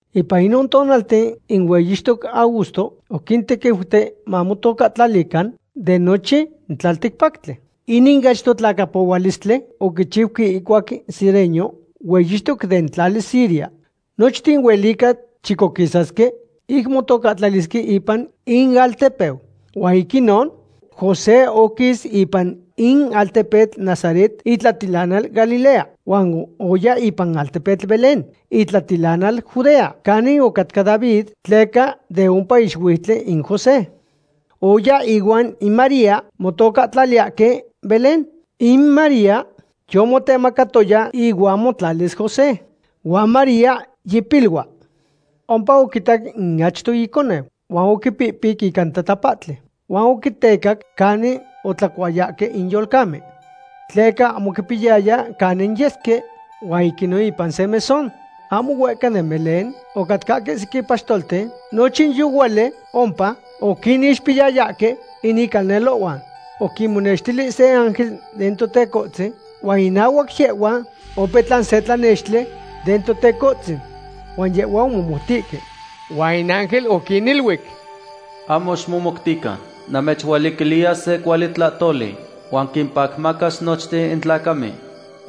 Ipan inon tonalten in hueyixtoc Augusto oquintequiuti mamotocahtlalican de nochin tlalticpactli. Inin achto tlacapohualistli oquichiuque ihcuac Cirenio hueyixtoc den tlali Siria. Nochten huelica chicoquisasque ic motocahtlalisque ipan inaltepeu. Huan ic inon, José oquis ipan in altepetl Nazaret, itlatilanal Galilea, huan oya ipan in altepetl Belén, itlatilanal Judea, canin otlacat David, tleca de ompa ixuiutli in José. Oya ihuan in María motocahtlaliyahque Belén. In María yomotemacatoya ihuan motlalis José, huan María yipilua. Ompa oquitac in achto iconeu, huan oquipihpiqui ica in tatapahtli, huan oquitecac canin otlacuayahque in yolcamen. Tleca ahmo oquipiyaya canin yesque huan ic inon ipan se mesón. Ahmo huehca den Belén ocatcahque sequin paxtolten nochin yohuali ompa oquinixpiyayahque in icalnelohhuan. Oquinmonextili se ángel den Totecohtzin, huan inahuac yehhuan opetlan se tlanextli den Totecohtzin. Huan yehhuan omomoutihque. Huan in ángel oquiniluic: ―Ahmo ximomoutican. Namechualiquiliya se cuali tlahtoli, huan quimpacmacas nochten in tlacamen.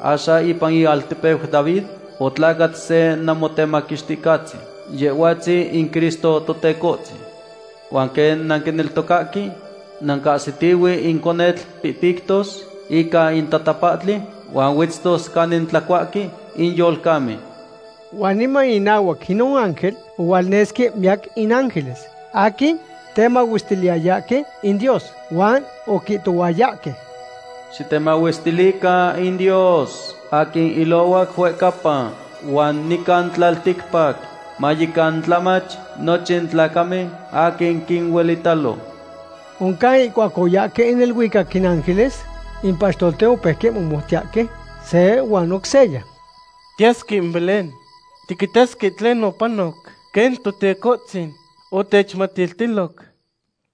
Axan ipan ialtepeu David otlacat se Namotemaquixticahtzin, Yehhuatzin in Cristo Totecohtzin. Huan quen nanquineltocahque, nancahsitihue in conetl pihpictos ica in tatapahtli huan huetztos canin tlacuahque in yolcamen. Huan niman inahuac inon ángel ohualnesque miyac in ángeles aquin temahuestiliyahque in Dios huan oquihtohuayahque: ¡Xitemahuestilican in Dios aquin ilohuac huehcapa, huan nican tlalticpac mayecan tlamach nochin tlacamen aquin quinuelitalo! Oncan ihcuac oyahque neluicac in ángeles, in paxtolten opeuque moluiyahque se huan oc seya: ―Tiyasque in Belén. Tiquitasque tlen opanoc quen Totecohtzin otechmatiltiloc.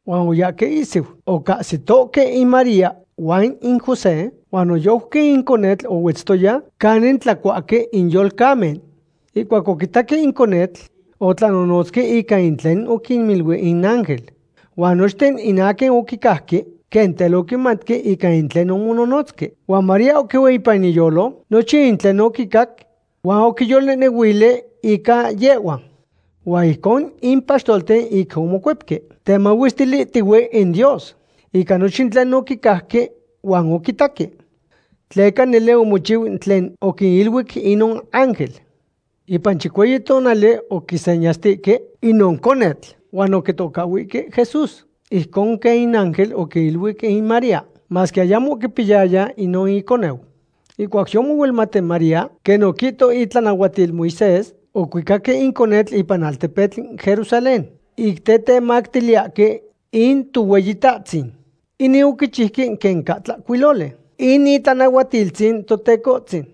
Huan oyahque ihsiu, ocahsitohque in María huan in José huan noyojqui in conetl ohuetztoya canin tlacuahque in yolcamen. Ihcuac oquitaque in conetl, otlanonotzque ica in tlen oquiniluic in ángel. Huan nochten in aquin oquicajque quen tel oquimatque ica in tlen omononotzque. Huan María oquieu ipan iyolo nochin tlen oquicac huan oquiyolnehnehuili ica yehhua. Huan ijcon in paxtolten ic omocuepque, temahuestilihtihue in Dios ica nochin in tlen oquicajque huan oquitaque, tleca nele omochiu in tlen oquiniluic inon ángel. Ipan chicueyi tonali oquisenyastihque inon conetl huan oquitocahhuihque Jesús, ijcon quen in ángel oquiluic in María, masque ayamo oquipiyaya inon iconeu. Ihcuac yomohuelmat in María, quen oquihto itlanahuatil Moisés, ocuicaque in conetl ipan in altepetl Jerusalén ic tetemactiliyahque in Tohueyitahtzin. Inin oquichiuque quen ca tlahcuiloli in itlanahuatiltzin Totecohtzin: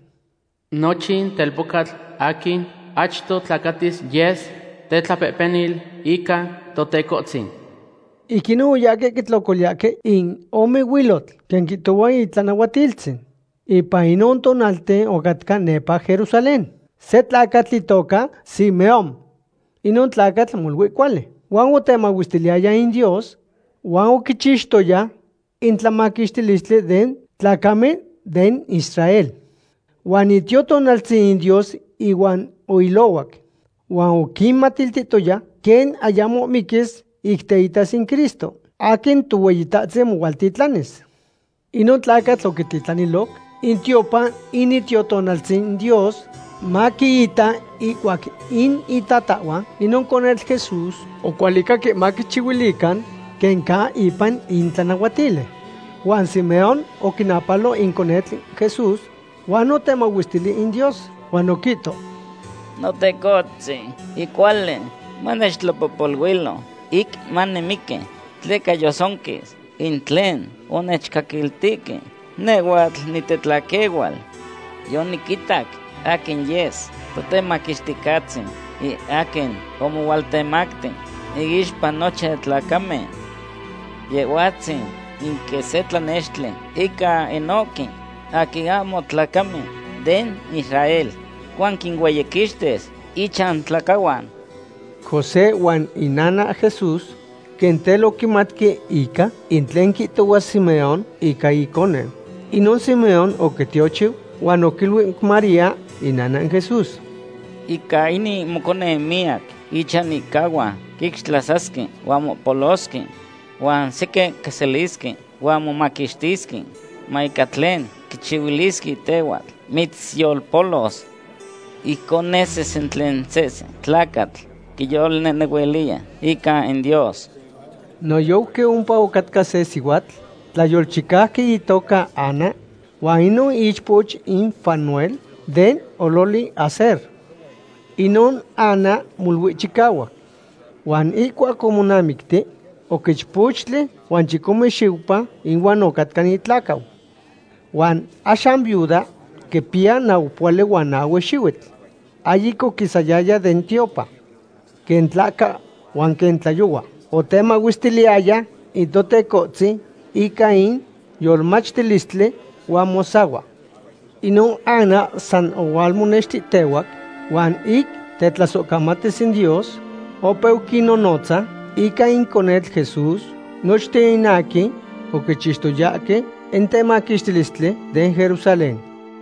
“Nochin telpocatl aquin achto tlacatis yes tetlapehpenil ica Totecohtzin.” Ic inon oyahque quitlocoliyahque in ome huilotl, quen quihtohua itlanahuatiltzin. Ipan inon tonalten ocatca nepa Jerusalén se tlacatl itoca Simeón. Inon tlacatl molui cuali huan otemahuestiliyaya in Dios huan oquichixtoya in tlamaquixtilistli den tlacamen den Israel. Huan in Itiotonaltzin Dios ihuan oilohuac. Huan oquimatiltihtoya quen ayamo miquis ic teitas in Cristo aquin Tohueyitahtzin mohualtitlanis. Inon tlacatl oquititlaniloc in tiopan in Itiotonaltzin Dios, maquiita ihcuac in itatahhuan inon conetl Jesús ocualicahque maquichihuilican quen ca ipan in tlanahuatili. Huan Simeón oquinapalo in conetl Jesús, huan otemahuestili in Dios, huan oquihto: ―Notecohtzin, yicuali manechtlapohpoluilo ic manimiqui, tleca yotzonquis in tlen onechcaquiltihque nehhuatl nitetlaquehual. Yoniquitac aquin yes Totemaquixticahtzin, in aquin omohualtemacti iixpa nochin tlacamen. Yehhuatzin in quen se tlanextli ica inohque aquin ahmo tlacamen den Israel huan quinueyiquixtis ichantlacahuan. José huan inana Jesús quen tel oquimatque ica in tlen quihtohua Simeón ica inconeu. Inon Simeón oquintiochiu huan oquiluic María inana in Jesús: ―Ica inin moconeu miyac ichanihcahuan quixtlasasque huan mopolosque. Huan sequin quiselisque huan momaquixtisque. Huan ica tlen quichihuilisque tehhuatl mitzyolpolos. Ijcon nesis in tlen sehse tlacatl quiyolnehnehuiliya ica in Dios. Noyojqui ompa ocatca se sihuatl tlayolchicauqui itoca Ana, huan inon ichpoch in Fanuel, den ololi Aser. Inon Ana molui chicahuac. Huan ihcuac omonamicti oc ichpochtli huan chicome xiupa ihuan ocatca itlacau. Huan axan viuda quipiya naupohuali huan nahue xihuitl. Ahyic oquisayaya den tiopan. Quen tlahca huan quen tlayohua otemahuestiliyaya in Totecohtzin ica in yolmachtilistli huan mosahua. Inon Ana san ohualmonextihtehuac, huan ic tetlasohcamatis in Dios, opeu quinnonotza ica in conetl Jesús nochten in aquin oquichixtoyahque in temaquixtilistli den Jerusalén.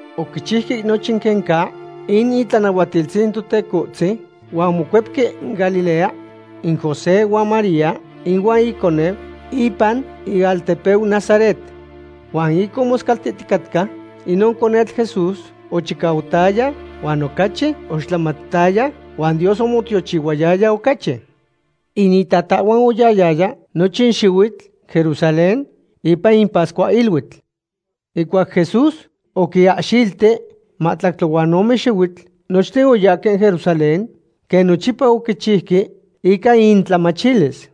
Oquichiuque nochin quen ca in itlanahuatiltzin Totecohtzin, huan omocuepque Galilea in José huan María ihuan iconeu ipan inaltepeu Nazaret. Huan ic omoscaltihticatca, inon conetl Jesús ochicautaya huan ocachi oixtlamautaya, huan Dios omotiochihuayaya ocachi. In itatahhuan oyahyaya nochin xihuitl Jerusalén ipan in pascuahiluitl. Ihcuac Jesús oquiahxilti mahtlactli huan ome xihuitl nochten oyahque Jerusalén, quen nochipa oquichiuque ica intlamachilis.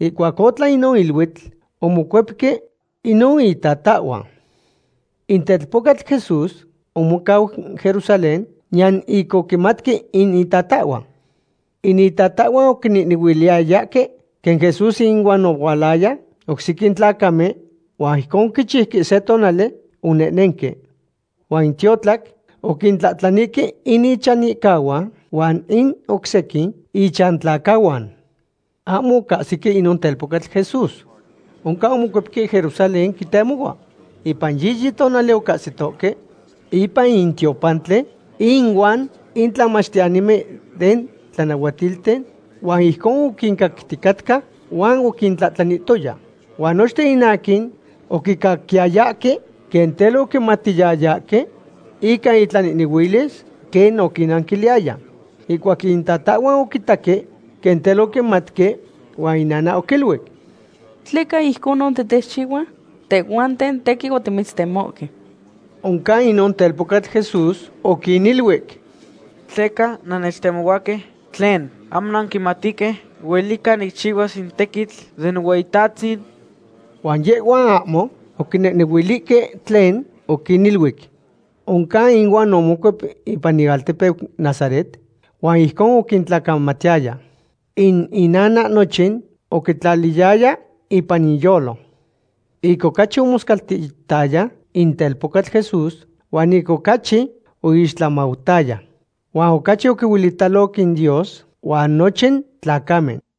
Ihcuac otlan inon iluitl, omocuepque inon itatahhuan. In telpocatl Jesús omocau Jerusalén, niyan ic oquimatque in itatahhuan. In itatahhuan oquinehnehuiliyayahque quen Jesús inuan ohualaya oc sequin tlacamen, huan ijcon oquichiuque se tonali onehnenque. Huan ic tiotlac oquintlahtlanihque in ichanihcahuan huan in oc sequin ichantlacahuan. Ahmo ocahsique inon telpocatl Jesús. Oncan omocuepque Jerusalén quitemohua. Ipan yiyi tonali ocahsitohque ipan in tiopantli inuan in tlamachtiyanimen den tlanahuatilten, huan ijcon oquincacticatca huan oquintlahtlanihtoya. Huan nochten in aquin oquicaquiyayahque quen tel oquimatiyayahque ica itlanehnehuilis quen oquinnanquiliyaya. Ihcuac itatahhuan oquitaque, quen tel oquimatque, huan inana oquiluic: ―¿Tleca ijconon titechchihua? Tehhuanten tequin otimitztemohque. Oncan inon telpocatl Jesús oquiniluic: ―¿Tleca nannechtemohuahque? ¿Tlen, ahmo nanquimatihque huelica nicchihuas in tequitl den Nohueyitahtzin? Huan yehhuan ahmo oquinehnehuilihque tlen oquiniluic. Oncan inuan omocuep ipan inaltepeu Nazaret, huan ijcon oquintlacamatiyaya. In inana nochin oquitlaliyaya ipan iyolo. Ic ocachi omoscaltihtaya in telpocatl Jesús, huan ic ocachi oixtlamautaya. Huan ocachi oquihuelitaloc in Dios huan nochin tlacamen.